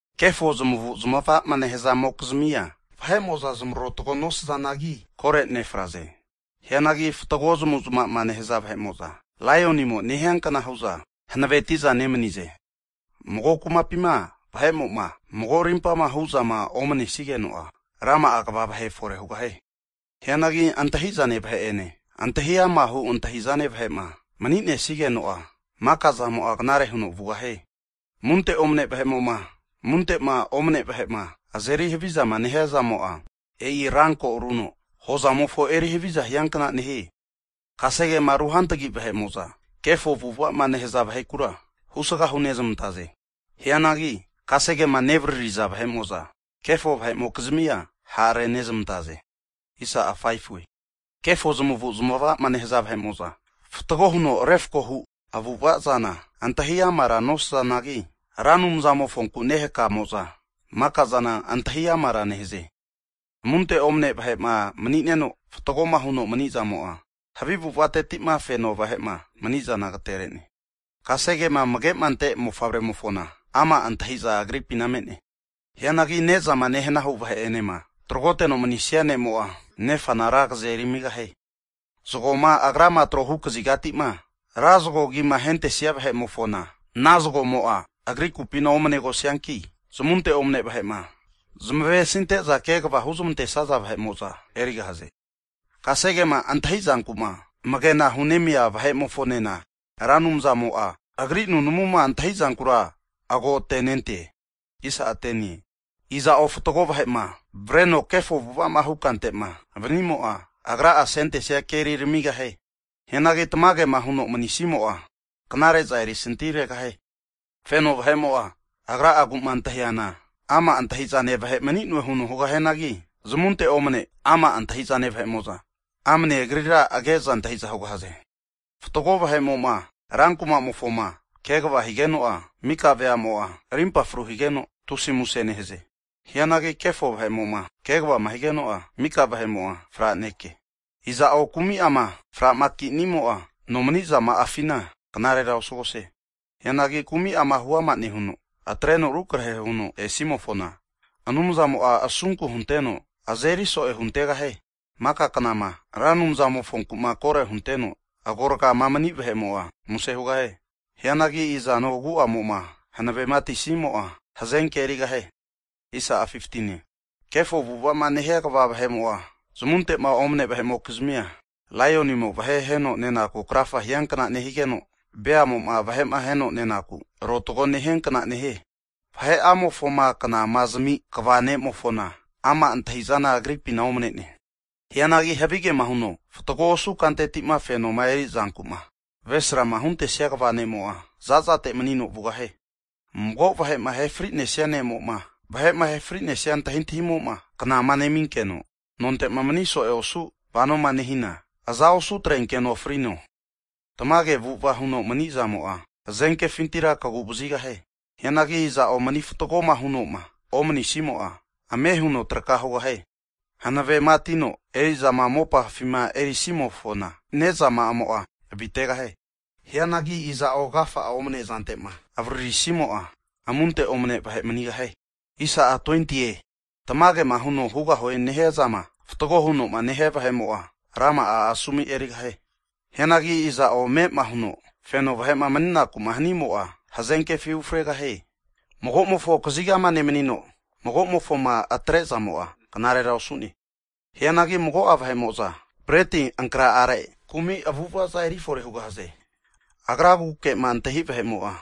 Kefo zamavu zamava'ma nehazamokizmia, vahe'mo'za zamarotgo nosazanagi, kore nefraze. Hianagi fatgo zamavu'zamava'ma nehaza vahe'mo'za, laionimo nehiankna hu'za hanavetiza nemanize. Mago kumapima vahe'mo'ma mago rimpama hu'zama omanesigeno'a, rama'a kva vahe fore hugahie. Hianagi antahizane vahe'ene antahi ama hu antahizane vahe'ma maninesigeno'a, maka zamo'a knare huno vugahie. Amunte omane vahe'mo'ma, amunte'ma omane vahe'ma azeri havizama nehiazamo'a, e'i ranko aruno hozamofo eri haviza hiankna nehie. Kasegema ruhantagi vahe'mo'za, kefo avu'avazama nehaza vahekura husga hunezmantaze. Hianagi kasegema nevaririza vahe'mo'za, kefo vahe'mokizmia ha' renezmantaze. Kefo zamavu' zamavama nehaza vahe'mo'za, fatgo huno refkohu avu'avazana antahi amara nosazanagi, Ra Anumzamofonkuma nehakamo'za makazana antahi amara nehaze. Amunte omane vahe'ma manineno fatgoma huno manizamo'a, havi avu'avatetima feno vahe'ma manizana agatere'ne. Kasegema amage'ma ante mofavre'mofona, ama' antahiza agripina me'ne. Hianagi nezama nehana hu vahe'enema tragoteno manisia ne'mo'a, nefana ra agaze erimigahie. Zagoma agrama trohu kazigatima ra zgo agima ahentesia vahe'mofona, ana zagomo'a agri kupina omanegosianki, zamunte omane vahe'ma zmavesinte'za kegvama huzmantesaza vahe'mo'za erigahaze. Kasegema antahizankuma amagena hunemia vahe'mofonena, Ra Anumzamo'a agri nunamuma antahizankura agotenente. Iza'o fatgo vahe'ma avreno kefo avu'avama hu kante'ma vanimo'a, agra'a asentenesia keri ramigahie. Hianagi tamagema huno manisimo'a, knare'za erisanti haregahie. Feno vahe'mo'a agra'aguma antahiana ama' antahizane vahe mani'noe huno hugahianagi, zamunte omane ama' antahizane vahe'mo'za, amane agrira age'za antahiza hugahaze. Fatgo vahe'mo'ma rankuma'mofoma kegvama higeno'a, mika ve'amo'a rimpa fru higeno, tusi muse nehaze. Hianagi kefo vahe'mo'ma kegvama higeno'a, mika vahe'mo'a franekie. Iza'o kumi'ama framakinimo'a, nomanizama'afina knarera osugahie. Hianagi kumi'ama hu ama nehuno, atreno arukrahe huno esimofona, Anumzamo'a asunku hunteno azeri so'e huntegahie. Maka knama Ra Anumzamofonku'ma koro hunteno agorgama mani vahe'mo'a, muse hugahie. Hianagi izano agu'amo'ma hanavema atisimo'a, hazenke erigahie. Kefo avu'avama nehia kva vahe'mo'a, zamunte'ma omane vahe'mokizmia, laionimo vahe aheno nenaku krafa hiankna nehigeno, beamo'ma vahe'ma aheno nenaku arotago nehianka nehie. Vahe'amofoma knama zami kva ne'mofona, ama' antahizana agripina omanene. Hianagi havigema huno fatgo osu kantetima fenoma erizanku'ma avesrama huntesia kva ne'mo'a, zazate manino vugahie. Mago vahe'ma ahefri'nesia ne'moma, vahe'ma ahe fri'nesia antahintahimo'ma knama neminkeno, nontema mani so'e osu vanoma nehina, aza osu atrenkeno frino. Tamage avu'ava huno manizamo'a, hazenkefintira kagu vazigahie. Hianagi iza'o mani fatgoma hunoma omanisimo'a, ame huno traka hugahie. Hanavema atino erizama mopafima erisimofona, ne'zama'amo'a avitegahie. Hianagi iza'o agafa'ama omanezante'ma avaririsimo'a, amunte omane vahe manigahie. Tamagema huno hugahue nehiazama fatgo hunoma nehia vahe'mo'a, rama'a asomu erigahie. Hianagi iza'o ame'ama huno feno vahe'ma maninaku'ma hanimo'a, hazenkefi ufregahie. Magomofo kazigama nemanino magomofoma atrezamo'a, knarera osu'ne. Hianagi mago'a vahe'mo'za breti ankra'are, kumi avu'avaza eri fore hugahaze. Agraguke'ma antahi' vahe'mo'a,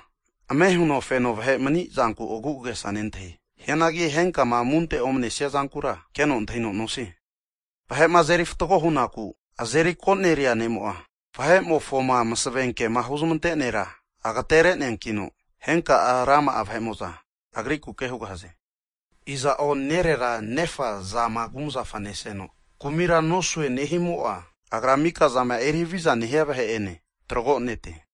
ame' huno feno vahe'ma manizanku agu'agesa nentahie. Hianagi henkama amunte omnesia zankura, keno antahino nosie. Vahe'ma azeri fatgo hunaku azeri koneria ne'mo'a, vahe'mofoma masavenkema huzamante nera agatereneankino, henka rama'a vahe'mo'za agrikuke hugahaze. Iza'o nerera nefa zama kumzafama neseno kumira nosue nehimo'a, agra mikazama eri havizama nehia vahe'ene tragonete.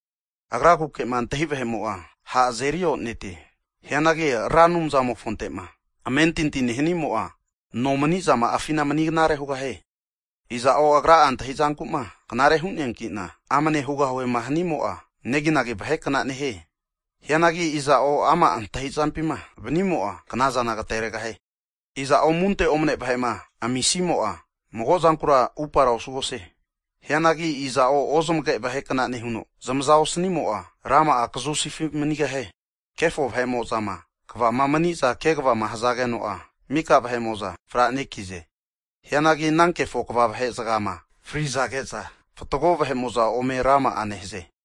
Agraguke'ma antahi vahe'mo'a, ha' azeri onetie. Hianagi Ra Anumzamofonte'ma amentinti nehanimo'a, nomanizama'afina mani knare hugahie. Iza'o agra'a antahizanku'ma knare hu'neankina amne hugahuema hanimo'a, neginagi vahe kna nehie. Hianagi iza'o ama' antahizampima vanimo'a, knazana agateregahie. Iza'o amunte omane vahe'ma amisimo'a, mago zankura upara osugahie. Hianagi iza'o ozamage vahe kna nehuno zamaza osanimo'a, rama'a kazusifi manigahie. Kefo vahe'mozama kvama maniza kegvama hzageno'a, mika vahe'mo'za fra'nekize. Hianagi ana kefo kva vahe'zgama frizage'za, fatgo vahe'mo'za ome rama'a nehaze.